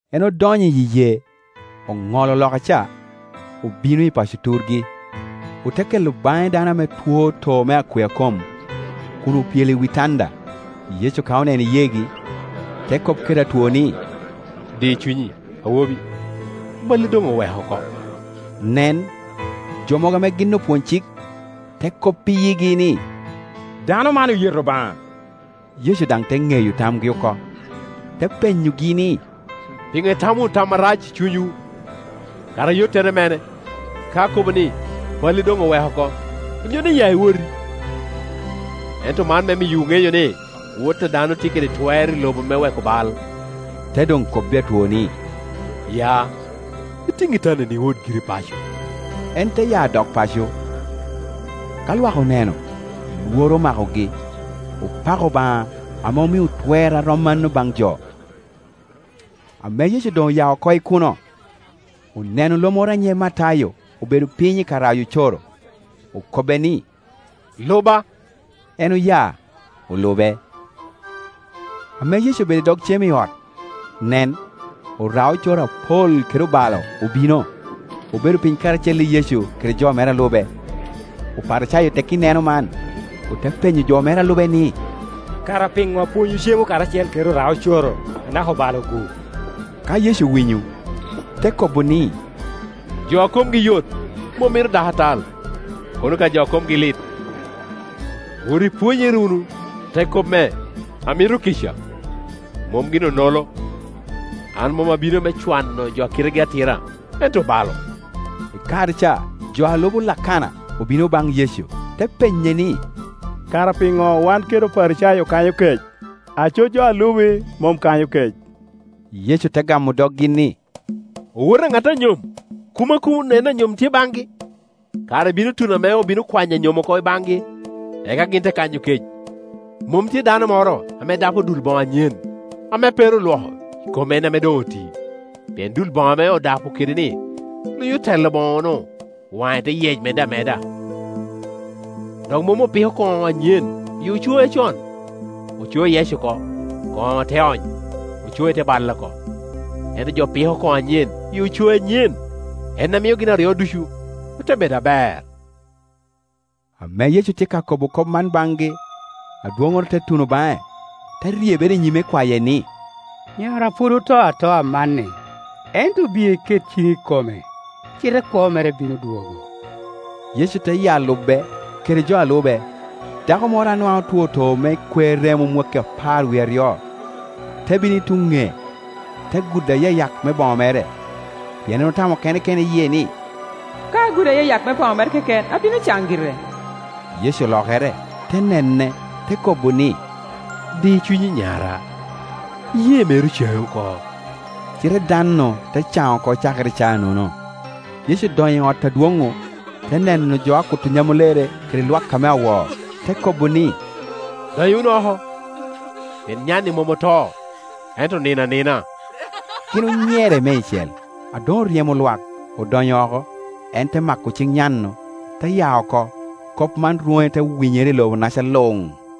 En odonyo i yee, oŋolo loka ca, obino i paco turgi Ote kelo baŋe dano ame two too me akwea kom, kun opyelo i wi tanda. Yecu ka oneno iyeegi, te kop kede atwo ni, “Di cunyi, awobi; balli doŋ oweko oko.” Nen, jo mogo ame gin opwony-cik, te kop i yigi ni, “Dano man oyeto Obaŋa.” Yecu daŋ te ŋeyo tamgi oko, te penyogi ni, “Piŋo itamo wunu tam arac i cunywu? Kara ayottere mene, ka akobo ni, ‘Balli doŋ oweko oko,’ onyo ni, ‘Ya, iwoti?’ Ento man me miyowu ŋeyo ni, Wot a dano tye kede twer i lobo me weko bal”, te doŋ kobbi atwo ni, “Ya, itiŋ itandani, iwot giri paco.” En te ya dok paco. Ka lwak oneno, lworo omakogi, opako Obaŋa ame omio twer a rom mano baŋ jo. Ame Yecu doŋ oya oko i kuno, oneno lo moro a nyiŋe Matayo obedo piny i ka rayo ocoro; okobbe ni, “Luba.” En oya, olube. Ame Yecu obedo i dog cem i ot, nen, ora-ocoro apol kede obalo obino, obedo piny karacel i Yecu kede jo mere a lube. Oparicayo tekki neno man, ote penyo jo mere a lube ni, “Kara piŋo apwonywu cemo karacel kede oraoco-ro anaka obalo-gu?” Ka Yecu owinyo, te kobo ni, “Jo a komgi yot mom mito dakatal, kono ka jo a komgi lit. Wot ipwonyere wunu te kop me, ‘Amito kica, mom gin oŋolo.’ An mom abino me cwano jo a kitegi atira, ento obalo.” I kare ca jo a lubo Lakana obino baŋ Yecu, te penye ni, “Kara piŋo wan kede Oparicayo okanyo kec, aco jo a lubi mom kanyo kec?” Yecu te gamo doggi ni, “Owote a ŋat a nyom kumo a kun en anyom tye baŋgi? Kare bino tuno ame obino kwanyo anyom oko i baŋgi, eka gin te kanyo kec. Mom tye dano moro ame dapo dul boŋo anyen, ame pe ru olwoko, i kom en ame doŋ oti, pien dul boŋo ame odapo kede-ni lunyo telo boŋe-nu, waŋe te yec medde ameda. Dok mom opiko koŋo anyen i ocoe acon; ocoe yec oko, koŋo te ony, ocoe te balle oko; ento jo piko koŋo anyen i ocoe anyen, en a mio gin aryo ducu ote bedo aber.” Ame Yecu tye ka kobo kop man baŋgi, adwoŋoro te tuno baŋe, te ryebere i nyime kwaye ni, “Nyara pwod oto atoa amanni; ento biye iket ciŋi i kome, cite kwo mere bino dwogo.” Yecu te ya lube, kede jo a lube. Dako moro a nwaŋ otwo too me kwer remo mwakki apar wie aryo, te bino i tuŋ ŋee, te gudo ayayak me boŋo mere; pien en otamo kene i yie ni, “Ka agudo ayayak me boŋo mere keken, abino caŋ gire.” Yecu olokere, te nene, te kobo ni, “Di cunyi, nyara, iyee meri ocaŋi oko,” Cite dano-nu te caŋ oko cakere i caa-nono. Yecu odonyo i ot adwoŋ-ŋu, te neno jo a kuto nyamulere kede lwak ame awo, te kobo ni, “Dony wunu oko; pien nya-ni mom oto ento onino anina.” Gin onyere meicel. A doŋ oryemo lwak, odonyo oko, en te mako ciŋ nyan-nu, te ya oko. Kop man rwoŋe te winyere i lobonaca luŋ.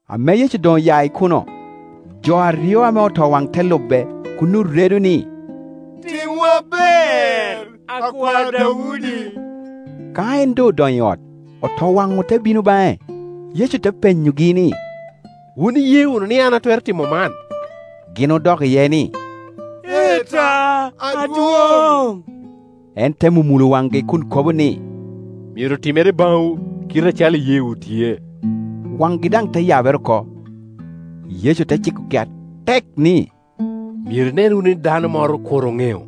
Ame Yecu doŋ oya i kuno, jo aryo ame otowaŋ te lube, kun oredo ni, “Timwa ber, Akwar Daudi.” Ka en doŋ odonyo i ot, otowaŋ-ŋu te bino baŋe, Yecu te penyogi ni, “Wun iye wunu ni an atwero timo man?” Gin odok iye ni, “Ee ta, adwoŋ.” En te mumulo waŋgi kun kobo ni, “Myero timere baŋwu i kite acalo iyeewu tye.” Waŋgi daŋ te yabere oko. Yecu te cikogi atek ni, “Myero inen wunu ni dano moro kur oŋeo.”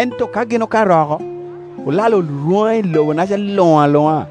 Ento ka gin okato oko, olalo rwoŋe i lobonaca luŋ aluŋa.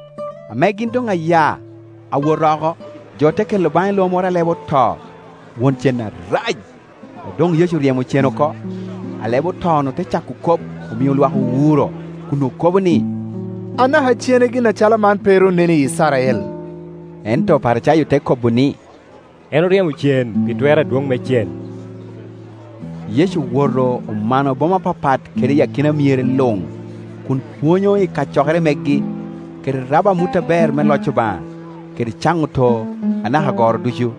Ame gin doŋ aya, awot oko, jo te kela baŋe lo moro a lebe oto, won cen arac. A doŋ Yecu oryemo cen oko, alebeoto-nu te cako kop, omio lwak owuro, kun okobo ni, “Anaka cene gin acalo man pe ru onen i Icrael.” Ento Oparicayo te kobo ni, “En oryemo cen pi twer adwoŋ me cen.” Yecu owoto omano boma apapat kede akina myere luŋ, kun pwonyo i kacokere megi, kede rabo amut aber me loc Obaŋa, kede caŋo too anaka goro ducu.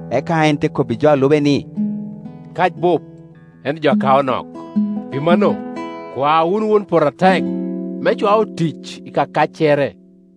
Eka en te kobbi jo a lube ni, “Kac bup, ento jo a kao nok Pi mano, kwa wunu Won poto atek me cwa otic i ka kaccere.”